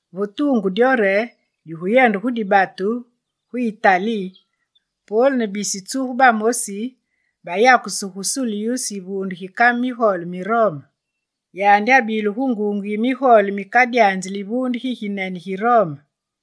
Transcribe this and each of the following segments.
Va tuungu dyo re diguyende mu dibatu gu Itali, Pol ne bisi tsugu bamosi bayakusu gu Sulyus yivuunde gi kame migole mi Rome. Yandi abile gu nguunge yi migole mikadyanzili yivuunde giginene gi Rome.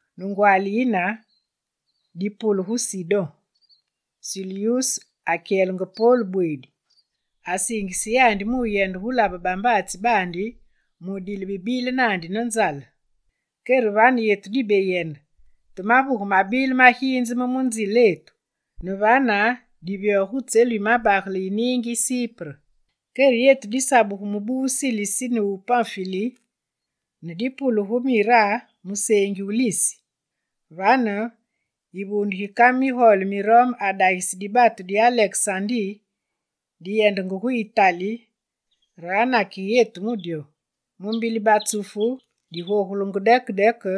Ne ngwaali yine dipule gu Sidon. Sulyus akyelenge Pol bweedi, asiingise yandi mu wuyende labe bambaatsi baandi mu wudile bibile naandi ne nzale. Kere vane, yetu dibeyende te mavuge mabile maginzeme mu nziletu, ne vane divyoge gu tselu yi mabagele yi niingi yi Sipre. Kere yetu disabugu mubu wu Silisi ne wu Panfili, ne dipule gu Mira gu museengi wu Lisi. Vane, yivuunde gi kame migole mi Rome adagise dibatu di Alekesandi diyendenge gu Itali re anakige yetu gu dyo. Mu mbili batsufu digoogulenge deke deke,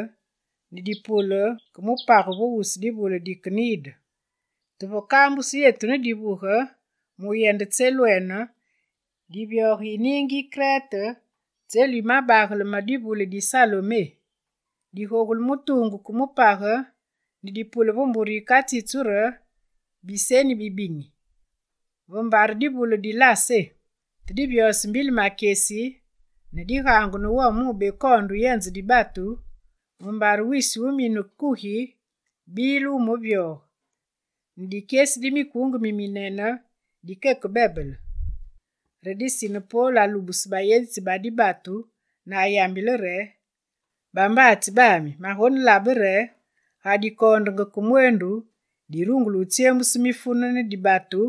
ne dipule ke mupage ve wusu divule di Knide. Te vakambusu yetu ne divuge mu wuyende tselwene, divyoge yi niingi yi Krete, tselu yi mabagale yi divule di Salmoné Digogule mu tuungu ke mu page ne dipule ve mbure yikatsitsu re «Biseni Bibinyi», ve mbare divule di Lasé. Te divyose mbili makyesi, ne digaangu ne wome mu wubekoonde wuyenze dibatu, mumbare wisi wu wumine kugi bile wumevyoge, ne dikyesi di mikunge miminene dikeke bebele. Re disine Pol alubuse bayenzitsi ba dibatu ne ayambile re: «Bambaatsi bami, magonelabe re ga dikoondenge ke mweendu, dirungule wutsyemuse mifune ne dibatu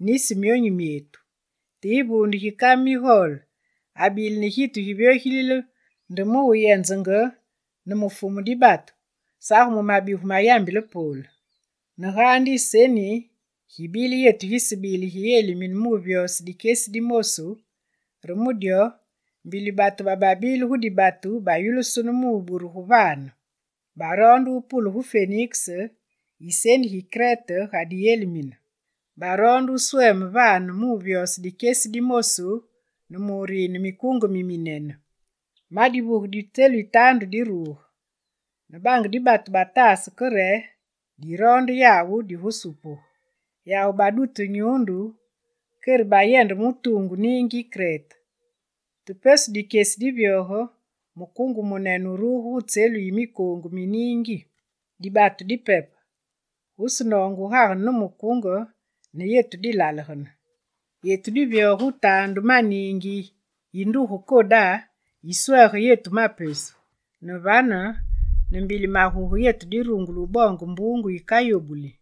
nisi myonyu myetu.» Te yivuunde gi kame migole mi Rome abile ne gitu givyogilile nde mu wuyenzenge ne mu fumu dibatu, sage mu mabigu mayambilenge Pol. Ne gaandi iseni gibile yetu gisebile giyelimine mu wuvyose dikyesi di mosu, re mu dyo mbili batu bababile gu dibatu bayulusunu mu wuburuge vane. Baroonde wupule gu Feniks iseni gi Krete ga diyelimine; baroonde wusweme vane mu wuvyose dikyesi di mosu ne mu wurine mikunge miminene. Ma divuge di tselu yi taandu diruge, ne bange dibatu bataase ke re diroonde yawu digusupugu. Yawu badute nyuundu, kere diyendenge mu tuungu niingi yi Krete. Te pesu dikyesi divyoge, mukunge wumunene wuruge gu tselu yi mikoongu mi niingi. Dibatu dipepe: gusenoonge wugagene ne mukunge ne yetu dilalegene. Yetu divyoge gu taandu ma niingi yi nduge Koda yiswege yetu ma pesu. Ne vane, ne mbili maguge, yetu dirungule wuboonge mbuungu yikayobuli.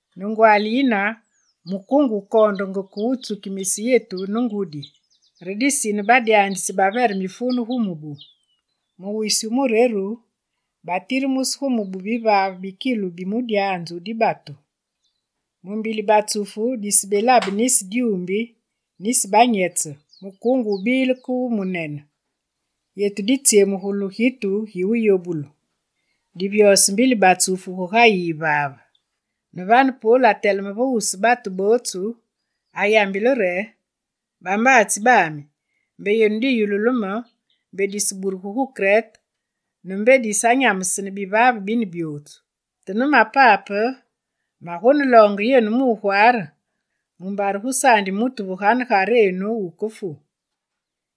Ne ngwaali yine, mukunge wukoondenge ke wutsukimise yetu ne ngudi, re disine badyanzitsi bavere mifune gu mubu. Wisi wu mureru, batiremuse gu mubu, bivaave bikilu bi mudyanzu wu dibatu. Mu mbili Batsufu, disebelabe nisi dyuumbi, nisi banyetsi, mukunge wubilenge ke wumunene. Yetu ditsyemugulu gitu gi wuyobulu. Divyose mbili batsufu gugayi yivave. Ne vane Pol ateleme va wusu batu bootsu, ayambile re: «Bambaatsi bami, mbe yenu diyululu me, mbe diseburugu gu Krete; ne mbe disanyamesene bivaave bine byootsu. Te ne mapape, magoneloonge yenu mu wugwaare mumbare gusaandi mutu vaganegarenu wukefu,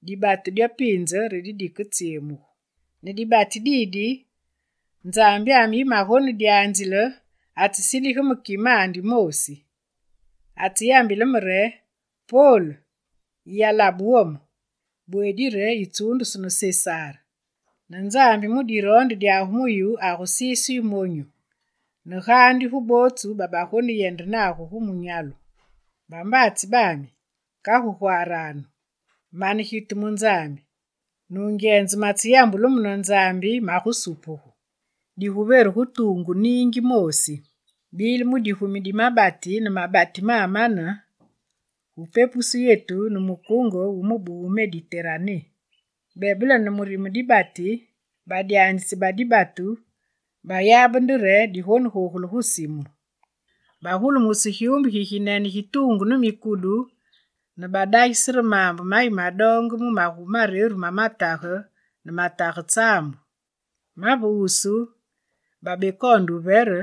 dibatu dyo piinze re diketsyemugu. Ne dibati didi, Nzambyami, yi magonedyanzile, atsesindigile me kimandi moosi. Atseyambile me re: “Pol, yiyayulu wome! Bweedi re yitsuundusu ne Sesar, ne Nzambi mu diroonde dyandi mu yu agusise yu monyu ne gaandi gu bootsu babagoneyende nagu gu munyalu.” Bambaatsi bami, kagu gwaaranu! Mane gitu mu Nzambi: nungyenze, matseyambulu me ne Nzambi magusupugu. Diguveru ve tuungu niingi moosi.» Bile mu digumi di mabati ne mabati mamane, gu bepepusu yetu ne mukunge gu mubu wu Mediterané. Bebele ne murime dibati, badyanzitsi ba dibatu bayabe nde re digonegogule gu simu. Bagulumuse gyumbu giginene gi tuungu ne mukudu ne badagise re maambe mayi madoonge mu magumi mareru ma matage ne matage tsaambu; ma ve wusu babekoonde wuvere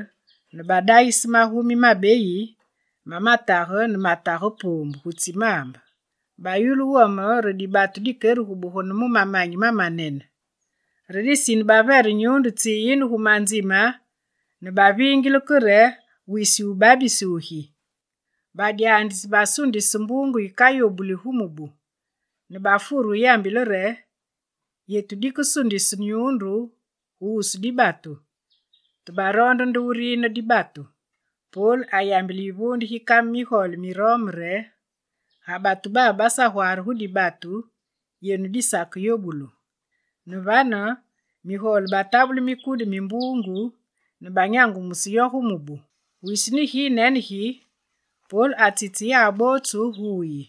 ne badagise magumi mabeyi ma matage ne matage poombu gu tsi maambe. Bayulu wome re dibatu dikeregubegane mu mamanyi mamanene. Re disine bavere nyuundu tsiyine gu manzime ne baviingile ke re wisi wu babisi wugi. Badyanzitsi basundise mbuungu yikayobuli gu mubu ne wufure wuyambile re: «Yetu dikesundise nyuundu gu wusu dibatu.» Te baroonde nde wurine dibatu. Pol ayambile yivuunde gi kame migole mi Rome ne migole re: «Ga batu babe basagwaare gu dibatu, yenu disakeyobulu.» Ne vane, migole batabule mikudu mi mbuungu ne banyangumuse yo gu mubu. Wisi ne ginene gi, Pol atsitse yawu bootsu gu wuyi,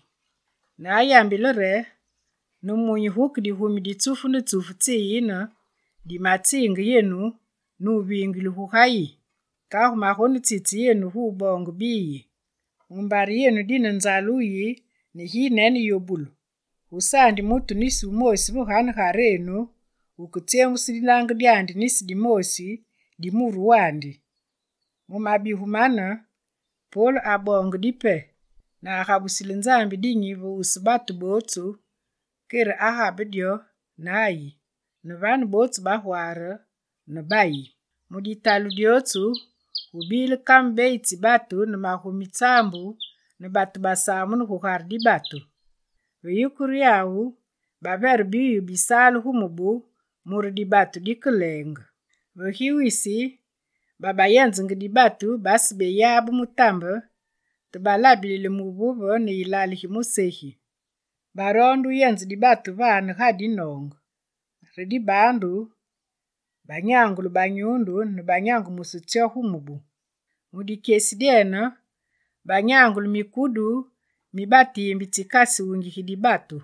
ne ayambile re: «Nemunyi guke digumi di tsufu ne tsufu tsiyine tsimatsiinge yenu ne wuviingile, gugayi. Kagu magonetsitse yenu gu wuboonge biyi, mumbare yenu dine nzale wuyi ne ginene yobulu. Gusaandi mutu va ganegarenu wuketsyemuse dinange nisi dimoosi di muru wandi.» Mu mabigu mane, Pol aboonge dipe ne agabusile Nzambi dinyi va wusu batu bootsu, kere agabe dyo ne ayi. Ne vane, bootsu bagwaare ne bayi. Mu ditalu dyootsu gubile kame beyi tsi batu ne magumi tsaambu ne batu basamunu gugare dibatu. Ve yikure yawu, bavere biwuyi bisale gu mubu mure dibatu dikeleenge. Ve gi wisi, babayenzenge dibatu basebeyabe mutambe, te balabilile muvuve ne ilale gi musegi. Baroonde wuyenze dibatu vane, ga dinoonge. Re dibaandu banyangule banyuundu ne banyangumuse tsyo gu mubu. Mu dikyesi dyene banyangule mikudu mi batiimbi tsikasuungigi dibatu.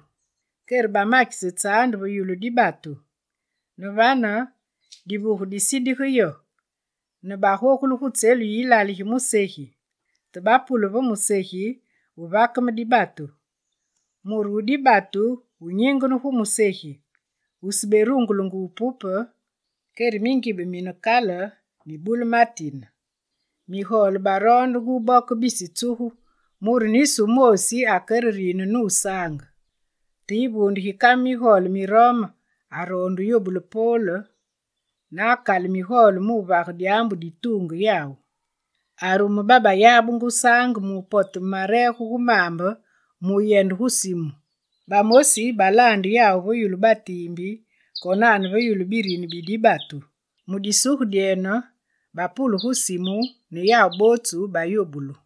Kere bamakise tsaande ve yulu dibatu. Ne vane divuge disindige yo, ne bagogule gu tselu yi ilale gi musegi. Te bapule ve musegi gu vakeme dibatu. Muru wu dibatu wunyingene gu musegi, wuseberungulenge wupupe, kere mingibe mine kale mibule matine. Migole baroondenge wuboke bisi tsugu mure nisi wumoosi akereriine nusaange. Te yivuunde gi kame migole mi Rome aroonde wuyobule Pol, ne akale migole mu wuvage dyaambu dituunge yawu. Arume babayabenge wusaange mu wupoteme mareege gu maambe mu wuyende gu simu. Bamosi balaande yawu ve yulu batiimbi konane ve yulu birini bi dibatu. Mu disuge dyene, bapule gu simu ne yawu bootsu bayobulu.